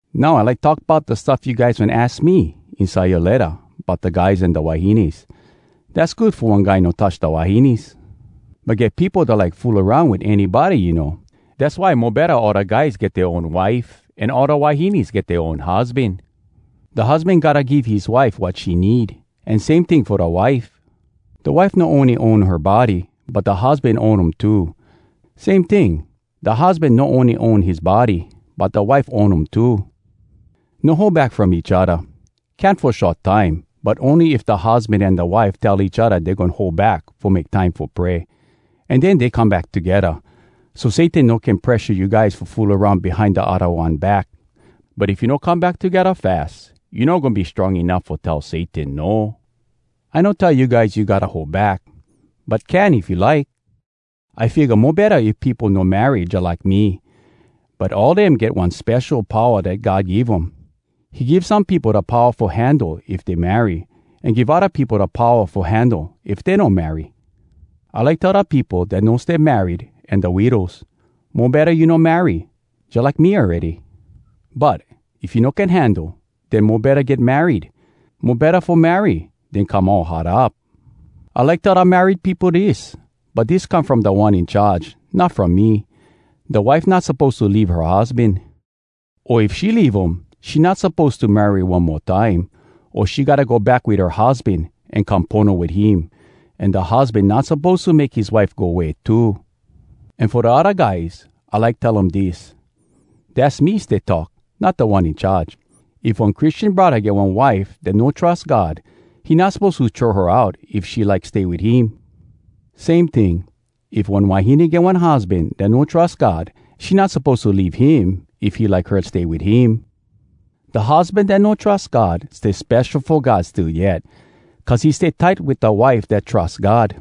Now I like talk bout da stuff you guys wen aks me inside yoa letta bout da guys an da wahines. Dass good fo one guy no touch da wahines. But get peopo dat like fool aroun wit anybody, you know. Dass why mo betta all da guys get dea own wife an all da wahines get dea own husban. Da husban gotta give his wife wat she need, an same ting fo da wife. Da wife no ony own her body, but da husban own um too. Same ting, da husban no ony own his body, but da wife own um too. No hold back from each odda. Can fo short time, but ony if da husban an da wife tell each odda dey goin hold back fo make time fo pray. An den dey come back togedda, so Satan no can presha you guys fo fool aroun behind da odda one back. But if you no come back togedda fas, you no goin be strong enuff fo tell Satan “No!” I no tell you guys you gotta hold back, but can if you like. I figga mo betta if peopo no marry jalike me. But all dem get one spesho powa dat God give um. He give some peopo da powa fo handle if dey marry, an give odda peopo da powa fo handle if dey no marry. I like tell da peopo dat no stay married an da widows: Mo betta you no marry, jalike me awready. But, if you no can handle, den mo betta get married. Mo betta fo marry den come all hot up. I like tell da married peopo dis (but dis come from Da One In Charge, not from me): Da wife not suppose to leave her husban. O if she leave um, she not suppose to marry one mo time, o she gotta go back wit her husban an come pono wit him. An da husban not suppose to make his wife go way too. An fo da odda guys, I like tell um dis (dass me stay talk, not Da One In Charge): If one Christian braddah get one wife dat no trus God, he not suppose to throw her out if she like stay wit him. Same ting, if one wahine get one husban dat no trus God, she not suppose to leave him if he like her stay wit him. Da husban dat no trus God stay spesho fo God still yet, cuz he stay tight wit da wife dat trus God.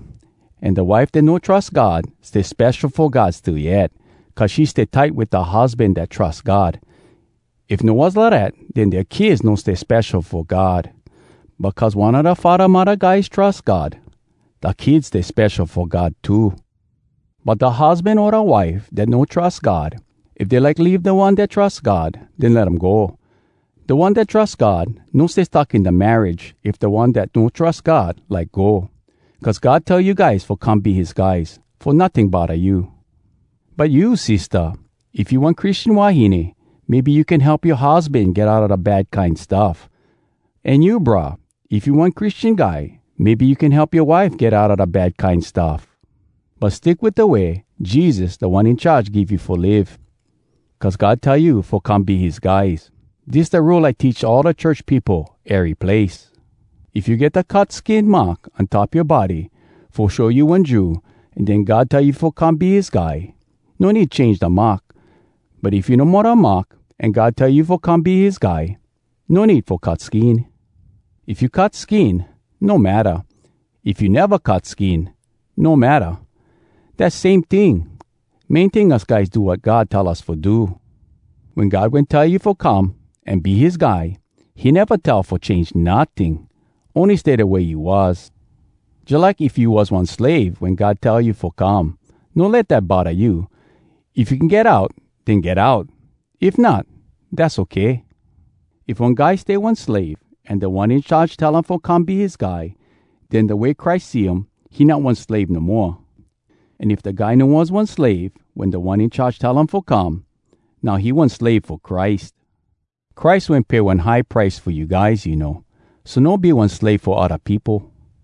An da wife dat no trus God stay spesho fo God still yet, cuz she stay tight wit da husban dat trus God. If no was lidat, den dea kids no stay spesho fo God. But cuz one a da faddah-muddah guys trus God, da kids stay spesho fo God too. But da husban o da wife dat no trus God, if dey like leave da one dat trus God, den let um go. Da one dat trus God no stay stuck in da marriage if da one dat no trus God like go. Cuz God tell you guys fo come be his guys, fo notting bodda you. But you sistah, if you one Christian wahine, maybe you can help yoa husban get outa da bad kine stuff. An you brah, if you one Christian guy, maybe you can help yoa wife get outa da bad kine stuff. But stick wit da way Jesus Da One In Charge give you fo live, cuz God tell you fo come be his guys. Dis da rule I teach all da church peopo ery place. If you get da cut skin mark on top yoa body fo show you one Jew, an den God tell you fo come be his guy, no need change da mark. But if you no mo da mark, an God tell you fo come be his guy, no need fo cut skin. If you cut skin, no matta. If you neva cut skin, no matta. Dass same ting. Main ting us guys do wat God tell us fo do. Wen God wen tell you fo come an be his guy, he neva tell fo change notting. Ony stay da way you was. Jalike, if you was one slave wen God tell you fo come, no let dat bodda you. If you can get out, den get out. If not, dass okay. If one guy stay one slave, an Da One In Charge tell um fo come be his guy, den da way Christ see um he not one slave no moa. An if da guy no was one slave wen Da One In Charge tell him fo come, now he one slave fo Christ! Christ wen pay one high price fo you guys, you know. So no be one slave fo odda peopo.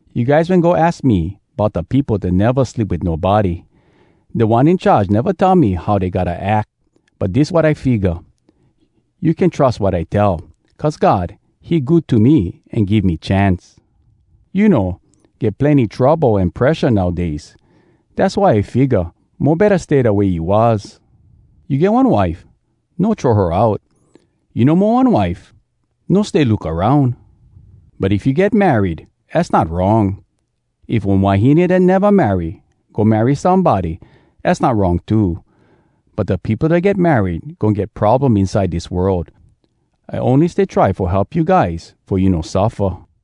You guys wen go aks me bout da peopo dat neva sleep wit nobody. Da One In Charge neva tell me how dey gotta ack, but dis wat I figga. You can trus wat I tell, cuz God, he good to me an give me chance. You know, get plenny trouble an presha nowdays. Dass why I figga, mo betta stay da way you was. You get one wife? No throw her out. You no mo one wife? No stay look aroun. But if you get married, az not wrong. If one wahine dat neva marry go marry somebody, az not wrong too. But da peopo dat get married goin get problem inside dis world. I ony stay try fo help you guys fo you no suffa.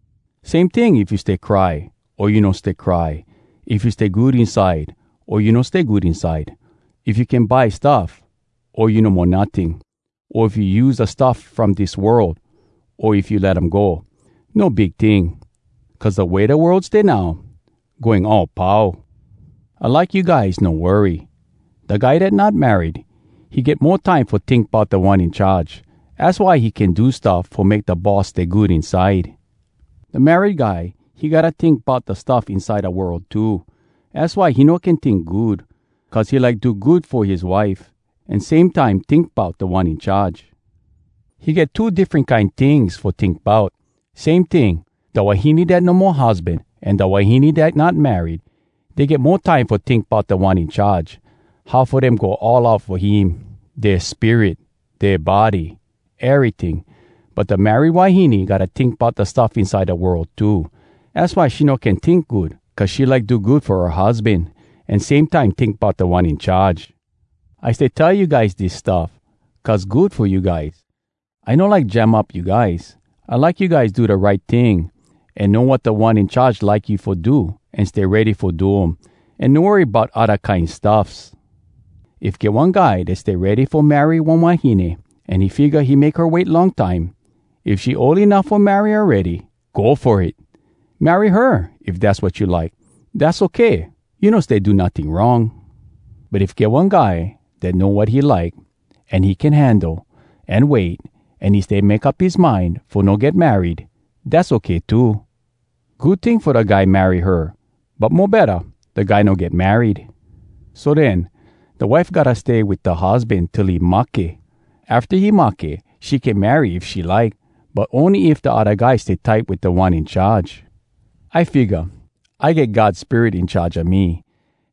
Same ting if you stay cry o you no stay cry, if you stay good inside o you no stay good inside, if you can buy stuff o you no mo notting, o if you use da stuff from dis world, o if you let um go, no big ting. Cuz da way da world stay now, goin all pau. I like you guys no worry. Da guy dat not married, he get mo time fo tink bout Da One In Charge, az why he can do stuff fo make da Boss stay good inside. Da married guy, he gotta tink bout da stuff inside da world too. Az why he no can tink good, cuz he like do good fo his wife, an same time tink bout Da One In Charge. He get two diffren kine tings fo tink bout. Same ting, da wahine dat no mo husban an da wahine dat not married, dey get mo time fo tink bout Da One In Charge, how fo dem go all out fo him, dea spirit, dea body, eryting. But da married wahine gotta tink bout da stuff inside da world too. Az why she no can tink good, cuz she like do good fo her husban, an same time tink bout Da One In Charge. I stay tell you guys dis stuff, cuz good fo you guys. I no like jam up you guys. I like you guys do da right ting, an know wat Da One In Charge like you fo do an stay ready fo do um, an no worry bout odda kine stuffs. If get one guy dat stay ready fo marry one wahine, an he figga he make her wait long time, if she ol enuff fo marry awready, go fo it! Marry her, if dass wat you like. Dass okay, you no stay do notting wrong. But if get one guy dat know wat he like, an he can handle, an wait, an he stay make up his mind fo no get married, dass okay too. Good ting fo da guy marry her, but mo betta, da guy no get married. So den, da wife gotta stay wit da husban till he mahke. Afta he mahke, she can marry if she like, but ony if da odda guy stay tight wit Da One In Charge. I figga, I get God Spirit in charge a me,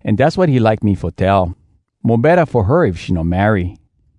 an dass wat he like me fo tell: Mo betta fo her if she no marry.